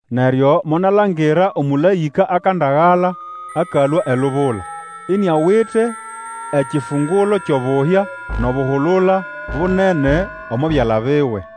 Neryo monalangira omũlaĩka akandagala akalũa elubula, iniawite ekifungulo kyʼobuhya, nʼobuhulula bunene omo byala biwe.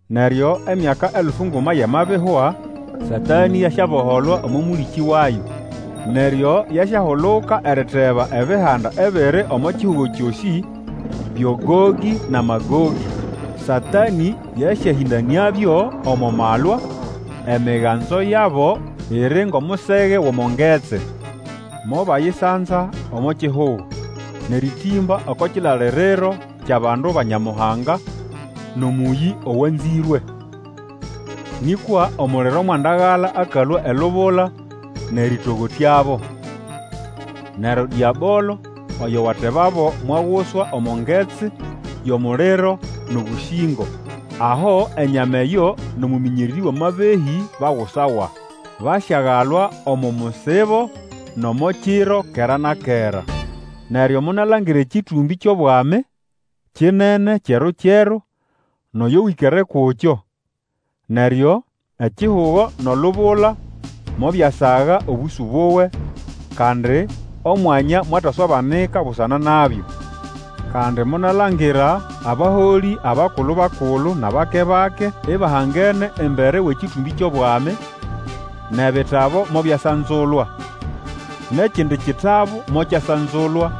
Neryo emyaka elfu nguma yamabihwa, Satanĩ yasyaboholwa omo mũlĩkĩ wayo. Neryo yasyahuluka eriteba ebihanda ebiri omo kihugo kyosĩ, byo Gogĩ na Magogĩ. Satanĩ yasyahĩndanĩabyo omo malwa; emiganzo yabo iri ngʼomusege wʼomo ngetsi. Mobayisanza omo kihugo, nʼerĩtĩmba oko kilaliriro kyʼabandu ba Nyamuhanga, nʼomũyĩ owanzĩrwe. Nĩkwa omuliro mwandagala akalũa elubula nʼerĩtogotyabo. Neryo Dĩabolo oyo watebabo mwaguswa omo ngetsi yʼomuliro nʼobũsĩngo, aho enyama eyo nʼomũmĩnyererĩ wʼamabehĩ bagusawa; basyagalwa omo musibo nʼomo kiro kera na kera. Neryo monalangira ekĩtũmbĩ kyʼobwami kinene kyeru-kyeru, nʼoyo wĩkere kukyo. Neryo ekihugo nʼolubula mobyasaga obũsũ buwe, kandi omwanya mwataswabanika busana nabyo. Kandi monalangira abaholĩ, abakulu-bakulu nʼabake-bake, ibahangene embere wʼekĩtũmbĩ kyʼobwami; nʼebitabu mobyasanzulwa. Nʼekindi kitabu mokyasanzulwa,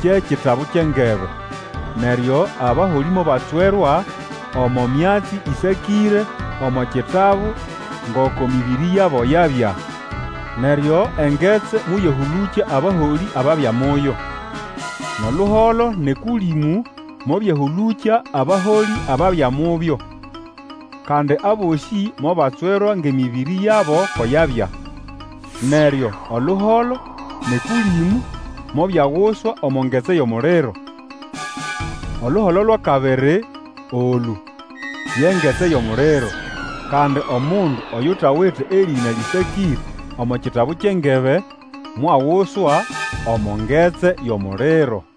kye kitabu kyʼengebe. Neryo abaholĩ mobatswerwa omo myatsi eyĩsakĩre omo bitabu ngoko emĩbĩrĩ yabo yabya. Neryo engetsi moyahũlũkya abaholĩ ababya muyo. Nʼoluholo nʼEkũlĩmũ mobyahũlũkya abaholĩ ababya mubyo. Kandi abosĩ mobatswerwa gʼemĩbĩrĩ yabo ko yabya. Neryo oluholo nʼEkũlĩmũ mobyaguswa omo ngetsi yʼomuliro. Oluholo lwʼakabiri olũ, ye ngetsi yʼomuliro. Kandi omundu oyutawite erĩna lĩsakĩre omo kitabu kyʼengebe, mwaguswa omo ngetsi yʼomuliro.